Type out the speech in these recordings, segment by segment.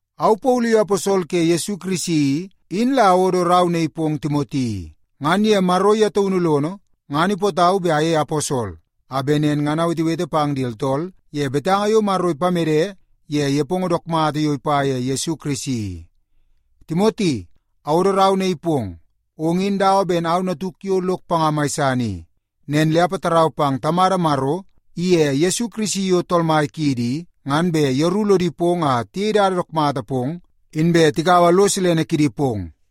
Au Paulu yo aposol ke Yesu Kirisi i, in la awodo rau naii pong Timoti i. Ngan ye Maro ye taunu lono, ngan ipootau bet ayei aposol a bet nen ngan awetewete pang di tooltool ye betanga yo Maro ipamede ye nepongo dook mata yo ipa ye Yesu Kirisi i. Timoti, awodo rau naii pong. Ong in dawa ben au natuk yo lok panga mai san i. Nen le apatarau pang Tamada Maro iye Yesu Kirisi yo Tool Mai kiidi i, ngan bet yeru lodi pong a tiyei dada dook mata pong inbe tikaua lo silene kidi pong.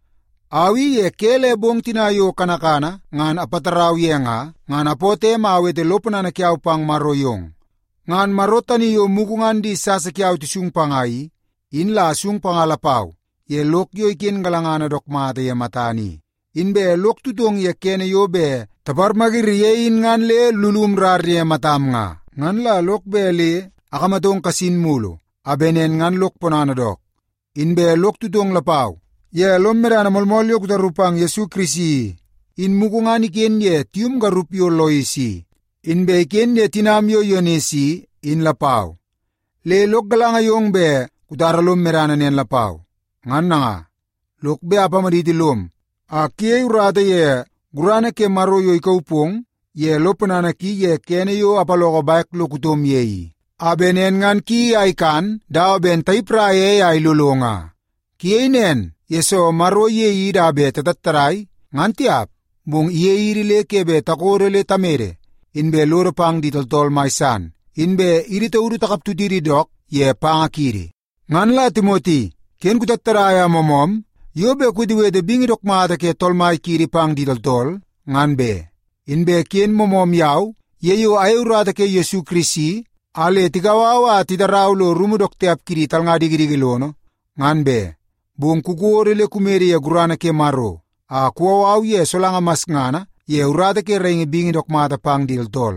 Au i ye ke le bong tina yo kanakana ngan apatarau ye nga, ngan apootoo em a awete lo ponana kiau pang Maro yong. Ngan Maro tani yo mugu ngan di niksasa tisung panga i, in la asung panga lapau ye lok yo iken galangana dook mata ye matana i. Inbe lok tutong ye kene yo bet taparmayiri ye in ngan lulum rar ye matam nga. Ngan la lok bet le akamatong kasin mulu a bet nen ngan lok ponana dook. Inbe lok tutong lapau ye lom medana moolmool yo kutaru pang Yesu Kirisi i, in mugu ngan iken ye tium garup yo Lois i, inbe iken ye tinam yo Yunis i, in lapau. Le lok galanga yong bet kutara lom medana nen lapau. Ngan nanga, lok bet apamaditi lom a kuyei urata ye gurana ke Maro yo ikauu pong ye lo ponana ki ye kene yo apaloko bek lo kutom ye i, a bet nen ngan kuyeii a ikan dawa ben tayipraia ei a ilolo nga. Kuyei nen, yesoo Maro iyei idi a bet tatattadai, ngan tiap. Bong iyei idi le ke bet takodo le tamede, inbe lodo pang di tooltool mai san, inbe idi taudu takaptutidi dook ye panga kiidi. Ngan la Timoti, ken kutattadai a moomoom yo bet kuwetewete bingi dook mata ke Tool Mai kiidi pang di tooltool, ngan be. Inbe ken moomoom yau ye yo ayei urata ke Yesu Kirisi a le tikau au a titarau lo rumu dook tiap kidi talnga dikidiki lono, ngan be. Bong kukodo le kumede ye gurana ke Maro a kuwau au ye solanga masngana ye urata ke raingi bingi dook mata pang di tooltool.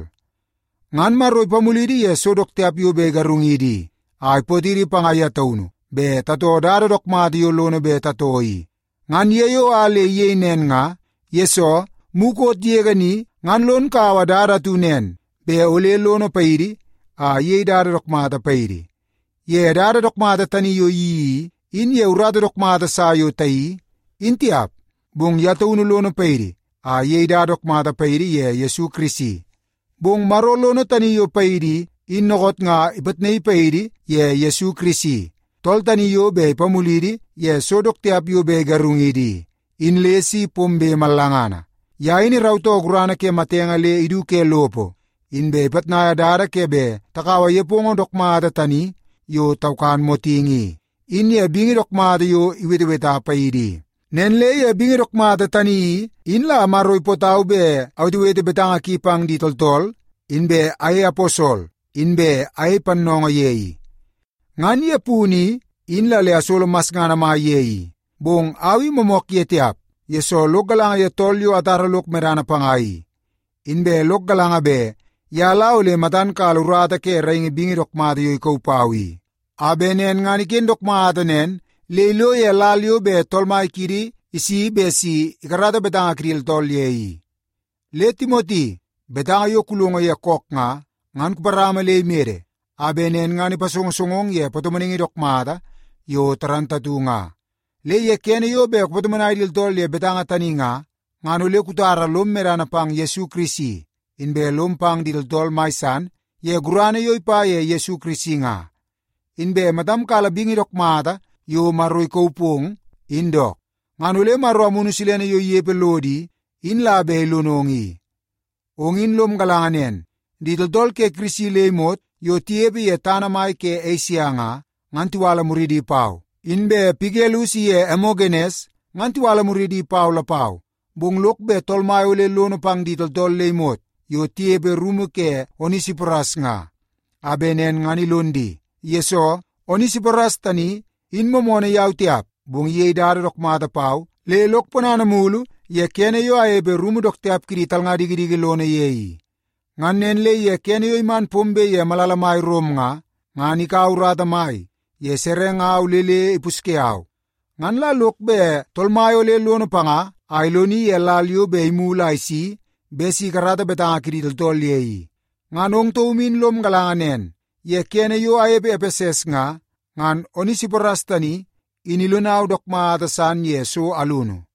Ngan Maro ipamulidi ye so dook tiap yo bet igarungidi i, a ipootidi panga ye taunu bet tatoo dada dook mata yo lono bet tatoo i. Ngan ye yo a le iyei nen nga, yesoo mukot yege ni ngan lon kaua dada atu nen bet ole lono paidi a iyei dada dook mata paidi. Ye dada dook mata tani yo iyeii i, in ye urata dook mata sa yo tayeii, in tiap. Bong ye taunu lono paidi a iyei dada dook mata paidi ye Yesu Kirisi. Bong Maro lono tani yo paidi i, in dookoot nga ipitnaii paidi ye Yesu Kirisi, tool tani yo bet ipamulidi ye so dook tiap yo bet igarungidi i, in le si pombe mallangana. Ye in irautoo gurana ke matenge le idu ke lopo, inbe ipitnaia dada ke bet takaua nepongo dook mata tani yo taukan motingi i, in ye bingi dook mata yo iweteweta paidi i. Nen le ye bingi dook mata tani i, in la Maro ipootau bet awetewete betanga ki pang di tooltool, inbe ayei aposol, inbe ayei pannoongoo ye i. Ngan ye punu in la le asolo masngana mai ye i. Bong au i moomook ye tiap, yesoo lok galanga ye tool yo atara lok medana panga i. Inbe lok galanga bet ye la ole matan kala urata ke raingi bingi dook mata yo ikauu pau i, a bet nen ngan iken dook mata nen le ilo ye lal yo bet Tool Mai kiidi isi bet si ikarata betanga kidi tooltool ye i. Le Timoti, betanga yo kulongo ye kook nga, ngan kuparama le imede a bet nen ngan ipasongosongong ye patomonaingi dook mata yo moolmool nga. Le ye kene yo bet kupatomonai di tooltool ye betanga tani nga, ngan ole kutara lom medana pang Yesu Kirisi, inbe lom pang di tooltool mai san ye gurana yo ipa ye Yesu Kirisi nga. Inbe matam kala bingi dook mata yo Maro ikauu pong, in dook. Ngan ole Maro Amunu Silene yo inepe lodo i, in la bet ilonong i. Ong in lom galanga nen, di tooltool ke Kirisi le imot yo tinepe ye tana mai ke Esia nga, ngan tiwala muridi pau. Inbe Pigelus iye Emogenes ngan tiwala muridi pau lapau. Bong lok bet Tool Mai ole lono pang di tooltool le imot yo tinepe rumu ke Onesiporas nga, a bet nen ngan ilon di. Yesoo, Onesiporas tani in moomoonoo yau tiap, bong iyei dada dook mata pau le lok ponana mulu ye kene yo anepe ye rumu dook tiap kidi talnga dikidiki lono ye i. Ngan nen le ye kene yo iman pombe ye malala mai Rom nga, ngan ikaua urata mai ye serengau le le ipusye au. Ngan la lok bet Tool Mai ole lono panga a iloni ye lal yo bet imulu a isi bet si ikarata betanga kidi tooltool ye i. Ngan ong taum in lom galanga nen ye kene yo anepe Epeses nga, ngan Onesiporas tani in ilonau dook mata san ye so alunu.